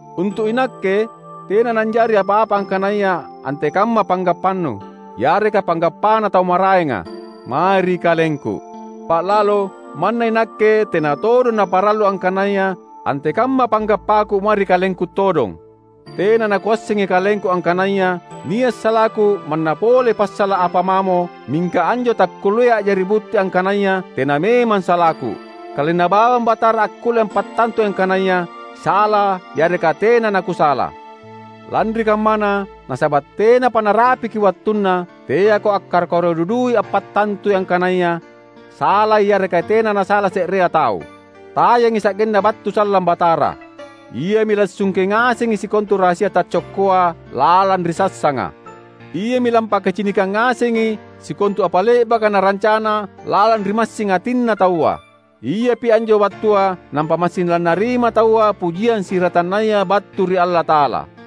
Untu’ inakke, tena nanjari apa-apa angkanaya antekamma panggappanu — yareka panggappana tau maraenga — mae ri kalengku. Ba’lalo manna inakke tena todong naparallu angkanaya antekamma panggappaku mae ri kalengku todong. Tena nakuassengi kalengku angkanaya nia’ salaku manna pole passala’ apa mamo; mingka anjo takkulleai a’jari butti angkanaya tena memang salaku. Kalenna bawang Batara akkulle ampattantui angkanaya sala’ yareka tena nakusala. Lanri kammana, nasaba’ tenapa narapiki wattunna, teako akkaro-karo dudui ampattantui angkanaya salai yareka tena nasala se’rea tau. Tayangi sa’genna battu sallang Batara. Iami lassungke ngasengi sikontu rahasia taccokkoa lalang ri sassanga. Iami lampakacinikang ngasengi sikontu apa le’baka narancana lalang ri massing atinna taua. Iapi anjo wattua nampa massing lannarima taua pujiang siratannaya battu ri Allata’ala.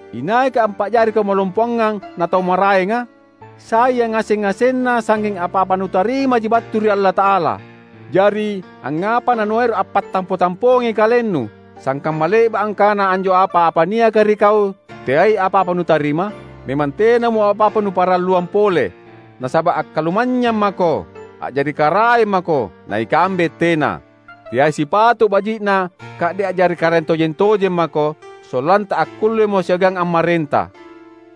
Inaika ampa’jariko malompoangang na tau maraenga? Sai yangaseng-ngasenna sangnging apa-apa nutarimaji battu ri Allata’ala. Jari angngapa nanuero’ ampattampo-tampoangi kalennu, sangkamma le’ba’ angkana anjo apa-apa niaka ri kau teai apa-apa nutarima? Memang tenamo apa-apa nuparalluang pole! Nasaba’ akkalumanynyang mako! A’jari karaeng mako! Na ikambe tena. Teai sipato’ baji’na ka’de’ a’jari karaeng tojeng-tojeng mako, sollanta akkullemo siagang ammarenta.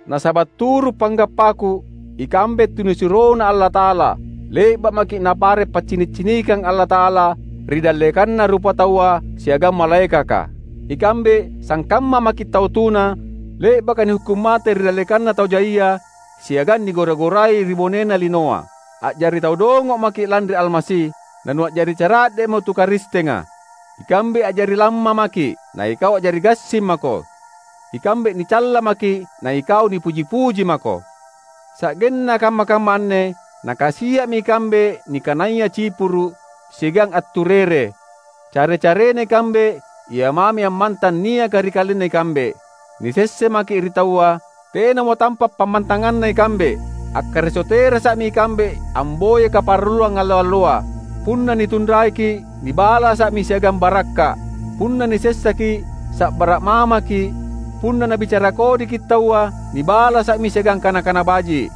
Nasaba’ turu’ panggappaku, ikambe tunisuroNa Allata’ala, le’ba’ maki’ Napare’ paccini’-cinikang Allata’ala ri dallekanna rupataua siagang malaekaka. Ikambe sangkamma maki’ tau tuna le’baka nihukkung mate ri dallekanna tau jaia siagang nigora-gorai ri bonena linoa. A’jari tau dongo’ maki’ lanri Almasi, nanua’jari cara’de’mo tu Karistenga! Ikambe a’jari lamma maki’, na ikau a’jari gassing mako! Ikambe nicalla maki’ na ikau nipuji-puji mako! Sa’genna kamma-kamma anne nakasia’mi ikambe nikanaya cipuru’ siagang atturere; care-carena ikambe ia mami ammantang niaka ri kalenna ikambe; nisessa maki’ ri taua; tenamo tampa’ pammantanganna ikambe; akkareso terasa’mi ikambe amboyai kaparalluang allo-alloa. Punna nitunraiki’, nibalasa’mi siagang barakka’; punna nisessaki’, sa’bara’ mamaki’; punna nabicara kodiki’ taua, nibalasa’mi siagang kana-kana baji’.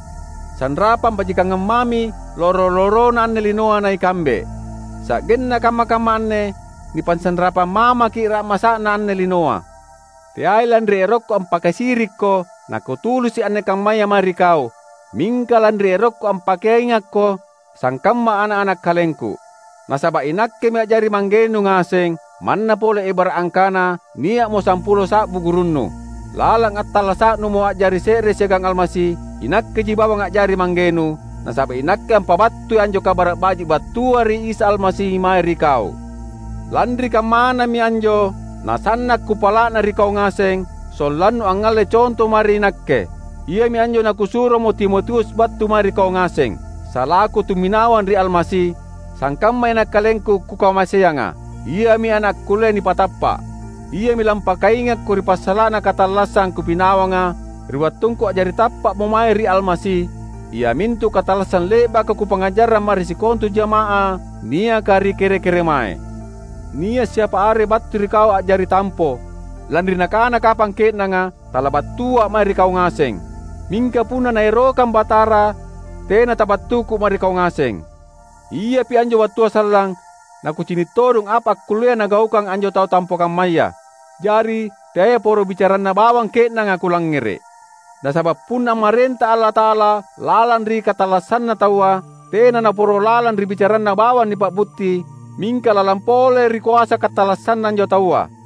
Sanrapang bajikangang mami loro-lorona anne linoa na ikambe; sa’genna kamma-kamma anne nipasanrapang mamaki’ ra’masa’na anne linoa. Teai lanri erokku ampakasirikko nakutulisi’ anne kammaya mae ri kau, mingka lanri erokku ampakaingakko sangkamma ana’-ana’ kalengku. Nasaba’ inakkemi a’jari manggenu ngaseng, manna pole ebara’ angkana nia’mo sampulo sa’bu gurunnu. Lalang attallasa’numo a’jari se’re siagang Almasi inakkeji bawang a’jari manggenu, nasaba’ inakke ampabattui anjo Kabara’ Baji’ battua ri Isa Almasi mae ri kau. Lanri kammanami anjo nasanna’ kupala’na ri kau ngaseng, sollannu angngalle conto mae ri nakke. Iami anjo nakusuromo Timotius battu mae ri kau ngaseng. Salaku tumminawang ri Almasi, sangkammai ana’ kalengku, kukamaseanga. Iami ana’ akkullea nipatappa’. Iami lampakaingakko ri passala’na katallassang kupinawanga ri wattungku a’jari tappa’mo mae ri Almasi; iamintu katallassang le’baka kupangngajarrang mae ri sikontu jamaah niaka ri kere-keremae. Nia’ siapa are battu ri kau a’jari tampo, lanri nakana kapang ke’nanga talabattua’ mae ri kau ngaseng. Mingka punna Naerokang Batara tena tabattuku mae ri kau ngaseng. Iapi anjo wattua sallang nakucini’ todong apa akkullea nagaukang anjo tau tampo kammaya; jari teai poro bicaranna bawang ke’nanga kulangngere’. Nasaba’ punna ammarenta Allata’ala lalang ri katallassanna taua, tena naporo lalang ri bicaranna bawang nipa’butti mingka lalang pole ri koasa katallassanna anjo taua.